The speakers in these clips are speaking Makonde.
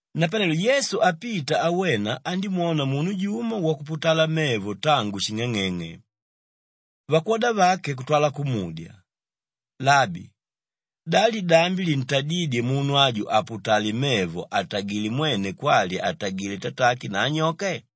Napanelo Yesu apita awena andímwona munu jumo wakuputala mevo tangu shing'ang'eng'e. Vakwoda vake kutwala kumudya, “Labi, da lidambi lintadídye munu aju aputale mevo atagilé mwene kwali atagilé tatake na anyoke?”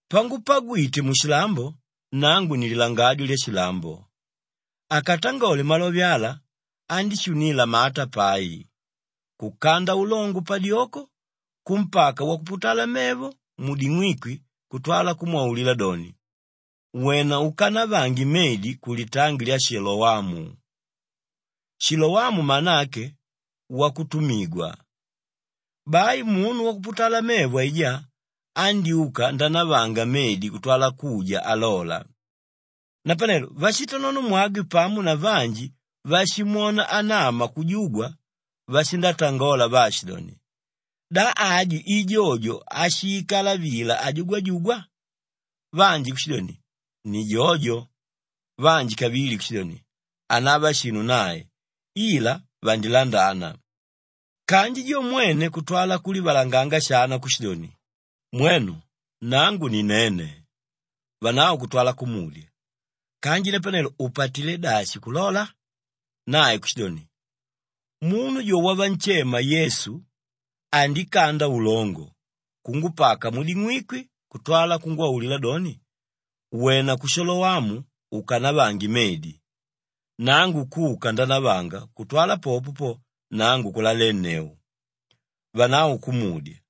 Pangupagwite mushilambo, nangu ni lilangadyo lyashilambo.” Akatangole malove ala, andíshunila mata pai, kukanda ulongo padyoko kumpaka wakuputala mevo muding'wikwi kutwala kumwaulila doni, “Wena ukanavange medi kulitangi lya Shilowamu,” Shilowamu mana ake wakutumigwa. Bai munu wakuputala mevo aijá andyúka ndanavanga medi kutwala kuja alola. Napanelo vashitanonomwagwe pamo na vanji váshimwona anama kujugwa, vashindatangola vaashidoni, “Da aju i jojo áshiikala vila ajugwajugwa?” Vanji kushidoni, “Ni jojo!” Vanji kavili kushidoni, “Hanava shinu nae, ila vandilandana.” Kanji jo mwene kutwala kulivalanga shana kushidoni, “Mwenu nangu ni nene.” Vanavo kutwala kumudya, “Kanji napanelo upatilé dashi kulola?” Nae kushidoni, “Munu jo wavanshema Yesu andikanda ulongo, kungupaka muding'wikwi kutwala kungwaulila doni, ‘Wena ku Shilowamu ukanavange medi.’ Nangu kuka ndanavanga kutwala popo po, nangu kulalenneu.” Vanavo kumudya,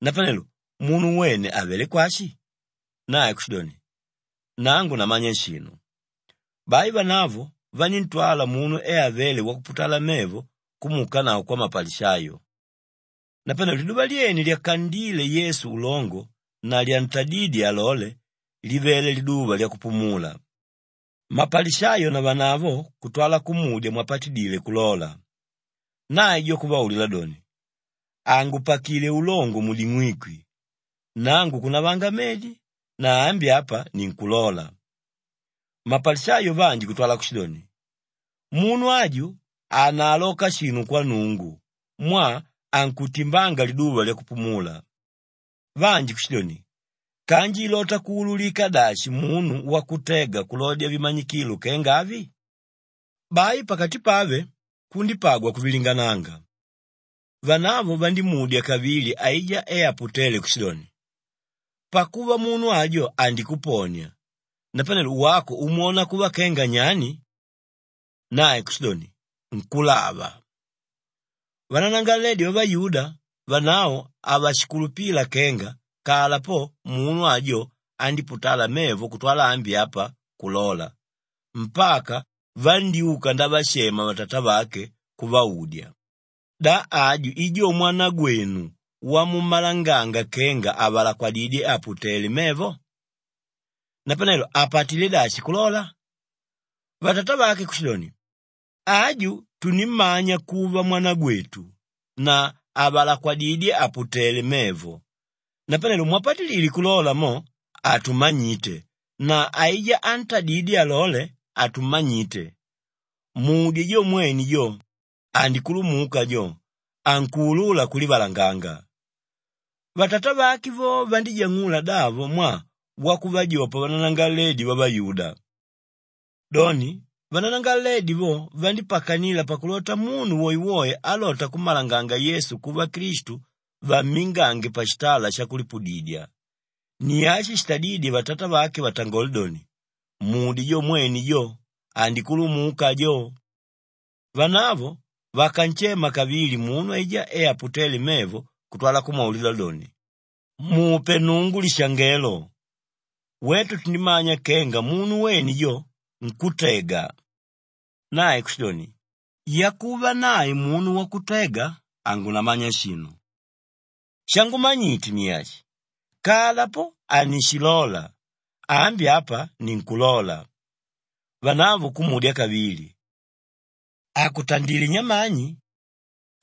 “Napanelo munu wene avelé kwashi?” Nae kushidoni, “Nangu namanya shinu.” Bai vanavo vaníntwala munu e avéle wakuputala mevo kumuukanavo kwamapalishayo. Napanelo liduva lyene lyakandíle Yesu ulongo na lyantadídye alole, livele liduva lyakupumula. Mapalishayo navanavo kutwala kumudya mwapatidile kulola. Nae jo kuvaulila doni, “Angupakilé ulongo muding'wikwi, nangu kunavanga medi na ambi apa ninkulola.” Mapalishayo vanji kutwala kushidoni, “Munu aju hanaaloka shinu kwa Nnungu mwaa ankutimbanga liduva lyakupumula.” Vanji kushidoni, “Kanji ilota kuululika dashi munu wakutega kulodya vimanyikilo kenga avi?” Bai pakati pave kundípagwa kuvilingananga. Vanavo vandímudya kavili aijá e aputéle kushidoni, “Pakuva munu ajo andikuponia, napanelo wako umwona kuva kenga nyani?” Nae kushidoni, “Nkúlava.” Vananangalaledi vavayuda, vanavo havashikulupila kenga kala po munu ajo andíputala mevo kutwala ambi apa kulola mpaka vandyúka ndavashema vatatavake kuvaudya, “Da aju i jo mwanagwenu wamummalanganga kenga avalakwadidyé àputele mevo? Napanelo apatilé dashi kulola?” Vatatavake kushidoni, “Aju tunimmanya kuva mwanagwetu na avalakwadidyé àputele mevo. Napane mwapatidile kulola mo, hatumanyite na aijá ántadidye alole, hatummanyite. Mudye jo mwene jo andikulumuka jo, ankuulula kulivalanganga.” Vatatavake vo vandíjang'ula davo mwaa wakuvajopa vananangalaledi vavayuda. Doni, vananangalaledi vo vandípakanila pakulota munu woewoe álota kummalanganga Yesu kuva Klistu vammingange pashitala shakulipudidya. Ni ashi shitadídye vatatavake vatangole doni, “Mudye jo mwene jo andikulumuka ajo.” Vanavo vakanshema kavili munu aijá e aputéle mevo kutwala kumwaulila doni, “Mupe Nnungu lishangelo! Wetu tundimanya kenga munu wene jo, nkùtega.” Nae kushidoni, “Yakuva nae munu wakutega hangunamanya shinu. Shangumanyite ni ashi: kala po hanishilola, ambi apa ninkulola.” Vanavo kumudya kavili, “Akutandilé nyamani?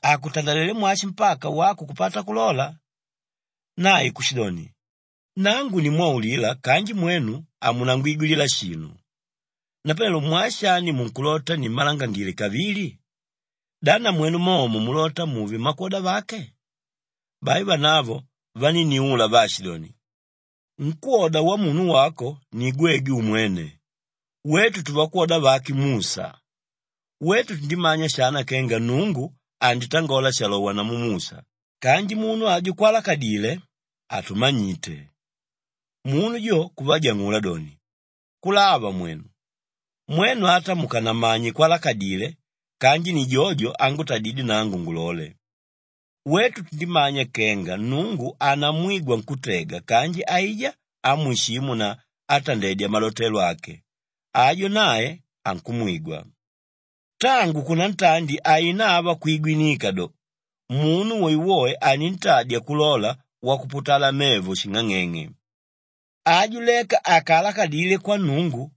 Akutandalelé mwashi mpaka wako kupata kulola?” Nae kushidoni, “Nangu nimwaulila kanji mwenu hamunangwigwilila shinu. Napanelo mwaa shani munkulota nimmalangile kavili? Da namwenu momo mulota muve mmakwoda vake?” Bai vanavo vanínniula vaashidoni, “Nkwóda wamunu wako ni gwegwe umwene. Wetu tuvakwoda vake Musha. Wetu tundimanya shana kenga Nnungu anditangola shalowa namu Musha kanji munu ajo kwalakadile, hatumanyite.” Munu jo kuvajang'ula doni, “Kulava mwenu! Mwenu ata mukanamanye kwalakadile kanji ni jojo ángutadidye nangu ngulole. Wetu tundimanya kenga Nnungu hanamwigwa nkútega kanji aijá ámwishimu na átandedya malotelo ake, ajo nae ankumwigwa. Tangu kunantandi hainava kwigwinika do, munu woewoe anintadya kulola wakuputala mevo shing'ang'eng'e. Aju leka àkaalakadile kwa Nnungu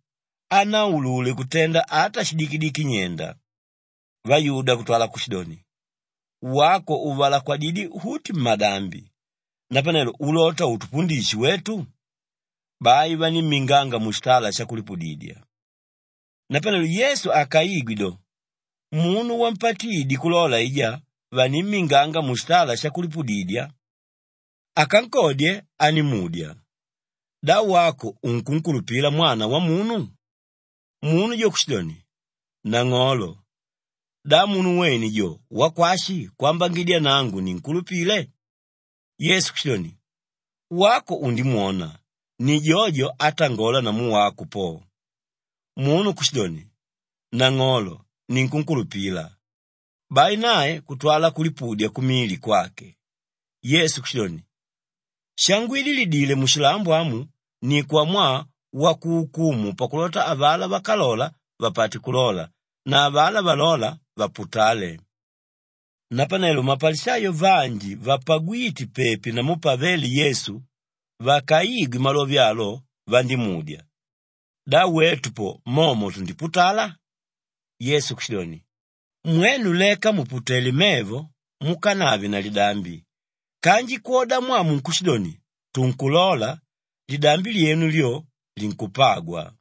hanaulule kutenda ata shidikidiki nyenda.” Vayuda kutwala kushidoni, “Wako uvalakwididyé uti mmadambi; napanelo ulota utupundishe wetu?” Bai vanímminganga mushitala shakulipudidya. Napanelo Yesu akaigwa do, munu wampatiidye kulola aijá vanimminganga mushitala shakulipudidya. Akankodye andímudya, “Da wako unkunkulupila Mwana Wamunu?” Munu jo kushidoni, “Nang'olo, da munu wene jo wakwashi kwambangidya nangu ninkulupile?” Yesu kushidoni, “Wako undimwona. Ni jojo átangola namu wako po.” Munu kushidoni, “Nang'olo ninkukulupila.” Bai nae kutwala kulipudya kumili kwake. Yesu kushidoni, “Shangwidilidile mushilambo amu ni kwamwaa wakuukumu pakulota avalá vákalola vapate kulola na avalá valóla, vaputale.” Napanelo mapalishayo vanji vapagwíte pepi namu pavéle Yesu vakaigwe malove alo vandímudya, “Da wetu po momo tundiputala?” Yesu kushidoni, “Mwenu leka mùputele mevo, mukanave na lidambi. Kanji kwodamwaa munkushidoni, ‘Tunkulola,’ lidambi lyenu lyo, linkupagwa.”